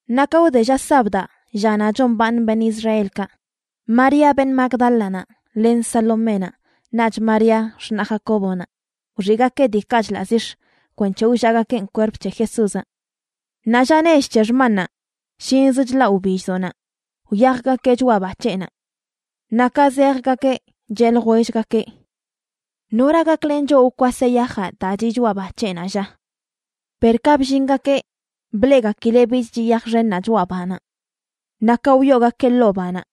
Naꞌ ka wde lla sabdaꞌ, llanaꞌ chombaaṉ beṉꞌ Israelkaꞌ, María beṉꞌ Magdálanaꞌ len Saloménaꞌ, naꞌch María, x̱naꞌ Jacóbonaꞌ, wxiꞌgakeꞌ diikaꞌ chḻaꞌ zix̱ kwenc̱he wllaꞌgakeꞌn kwerp c̱he Jesúzaꞌ. Naꞌ lla nech c̱he xmannaꞌ, shinzə chlaꞌ wbilldoꞌnaꞌ, wyajgakeꞌ choꞌa ba c̱heꞌnaꞌ. Naꞌ ka zejgakeꞌ cheꞌ ljwellgakeꞌ: ―¿Nora gaklen choꞌ wkwaseꞌ yajaꞌ daa chiꞌ choꞌa ba c̱heꞌnaꞌ, lla? Per ka bllingakeꞌ, bleꞌgakileꞌ bich chiꞌ yaj xennaꞌ choꞌa banaꞌ. Naꞌ ka wyoogakeꞌ ḻoo banaꞌ,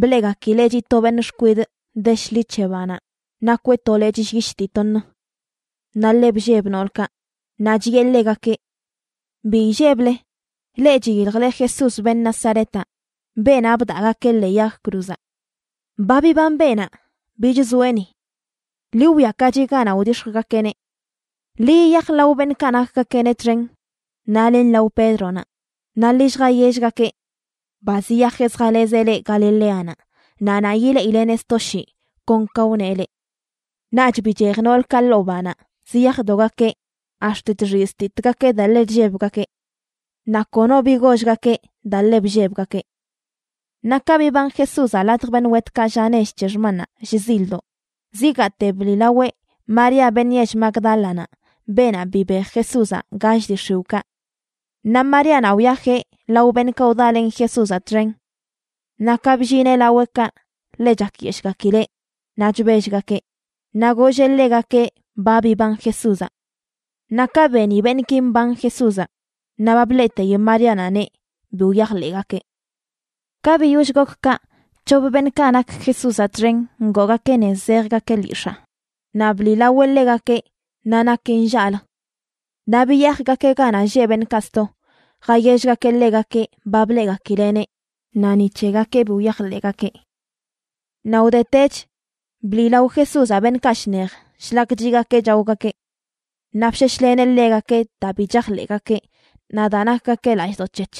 bleꞌgakileꞌ chiꞌ to beṉꞌ xkwidꞌ de shḻi c̱he banaꞌ nakweꞌ to lechꞌ llyish dii toṉ. Naꞌ ḻe blleb noolkaꞌ. Naꞌ chiꞌe ḻegakeꞌ: ―Bi illeble. Leꞌ chiyiljle Jesús, beṉꞌ Nazaretaꞌ, beenaꞌ bdaꞌgakeꞌ ḻee yag cruzaꞌ. Ba biban beenaꞌ, bich zoeꞌ ni. Ḻi wwiakachi ganaꞌ wdix̱jgakeꞌneꞌ. Ḻi yiyaj lao beṉꞌkaꞌ nakgakeꞌneꞌ txen naꞌ len lao Pédronaꞌ, naꞌ ḻi lljayellgakeꞌ: “Ba ziyajeꞌ zjalezeꞌ leꞌ Galileanaꞌ, naꞌ naꞌ yileꞌileꞌneꞌ sto shii, kon ka wneꞌ leꞌ.” Naꞌch bichej noolkaꞌ ḻoo banaꞌ ziyajdogakeꞌ ax̱t chxiztitgakeꞌ daa ḻe chllebgakeꞌ. Naꞌ kono bi gollgakeꞌ daa ḻe bllebgakeꞌ. Naꞌ ka biban Jesúzaꞌ ladj beṉꞌ wetkaꞌ lla nech c̱he xmannaꞌ shzildoꞌ, zigaate bliꞌlaweꞌ María beṉꞌ yell Magdálanaꞌ, beenaꞌ bibej Jesúzaꞌ gall dii x̱iwꞌkaꞌ. Naꞌ Maríanaꞌ wyajeꞌ lao beṉꞌkaꞌ wdalen Jesúzaꞌ txen. Naꞌ ka bllineꞌ laweꞌkaꞌ ḻe chakyeshꞌgakileꞌ naꞌ chbellgakeꞌ, naꞌ golleꞌ ḻegakeꞌ ba biban Jesúzaꞌ. Naꞌ ka beni beṉꞌki mban Jesúzaꞌ naꞌ ba bleꞌteyi Maríanaꞌneꞌ, bi wyajḻeꞌgakeꞌ. Ka biyoll gok kaꞌ, c̱hop beṉꞌkaꞌ nak Jesúzaꞌ txen ngoogakeꞌ nez zejgakeꞌ lyix̱aa, naꞌ bliꞌlaweꞌ ḻegakeꞌ naꞌ nakeꞌ nllaꞌlə. Naꞌ biyajgakeꞌ ganaꞌ lleꞌ beṉꞌkaꞌ sto, jayellgakeꞌ ḻegakeꞌ ba bleꞌgakileꞌneꞌ, naꞌ ni c̱hegakeꞌ bi wyajḻeꞌgakeꞌ. Naꞌ wdetech, bliꞌlao Jesúzaꞌ beṉꞌkaꞌ shnej shlak chiꞌgakeꞌ chaogakeꞌ. Naꞌ bsheshleneꞌ ḻegakeꞌ daa bi chajḻeꞌgakeꞌ naꞌ daa nakgakeꞌ lallꞌdoꞌ c̱hec̱h,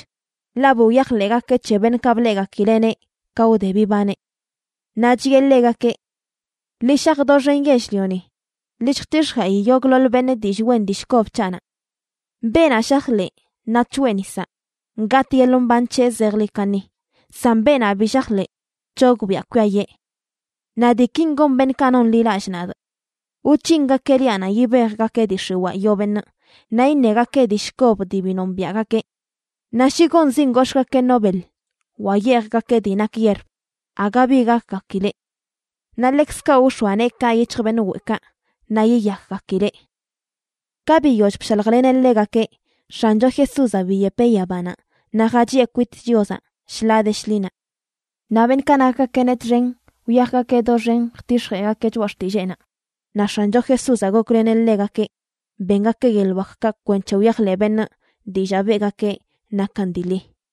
ḻaꞌ bi wyajḻeꞌgakeꞌ c̱he beṉꞌkaꞌ bleꞌgakileꞌneꞌ ka wde bibaneꞌ. Naꞌ chiꞌe ḻegakeꞌ: ―Ḻi shaj doxen yell-lioni, ḻi lljtix̱jeꞌi yogꞌḻoḻ beṉꞌ dillꞌ wen dillꞌ kob c̱haꞌnaꞌ. Beenaꞌ shajḻeꞌ naꞌ c̱hoeꞌ nisaꞌ, gatꞌ yeḻꞌ mban c̱heꞌ zejḻi kaṉi, san beenaꞌ bi shajḻeꞌ, c̱hogbiꞌa kwiayee. Naꞌ diikin gon beṉꞌkaꞌ nonḻilallꞌ nadꞌ: wc̱hingakeꞌ liaꞌnaꞌ yibejgakeꞌ dii x̱iwaa yoo beṉꞌ; naꞌ iṉegakeꞌ dillꞌ kob dii bi nombiaꞌgakeꞌ; naꞌ shi gonzin gox̱ꞌgakeꞌ no beḻ wa yeejgakeꞌ dii nak yierb, aga bi gakgakileꞌ. Naꞌ ḻekzkaꞌ wx̱oa neekaꞌ yic̱hj beṉꞌ weꞌkaꞌ naꞌ yiyakgakileꞌ. Ka biyoll bshaljleneꞌ ḻegakeꞌ, X̱ancho Jesúzaꞌ biyepeꞌ yabanaꞌ naꞌ jachiꞌe kwit Chiozaꞌ shḻaa de shḻinaꞌ. Naꞌ beṉꞌkaꞌ nakgakeꞌneꞌ txen wyajgakeꞌ doxen jtix̱jeꞌgakeꞌ choꞌa xtilleenaꞌ naꞌ X̱ancho Jesúzaꞌ gokleneꞌ ḻegakeꞌ bengakeꞌ yeḻꞌ wakkaꞌ kwenc̱he wyajḻeꞌ beṉꞌ dillaa beꞌgakeꞌ nakan dii ḻi.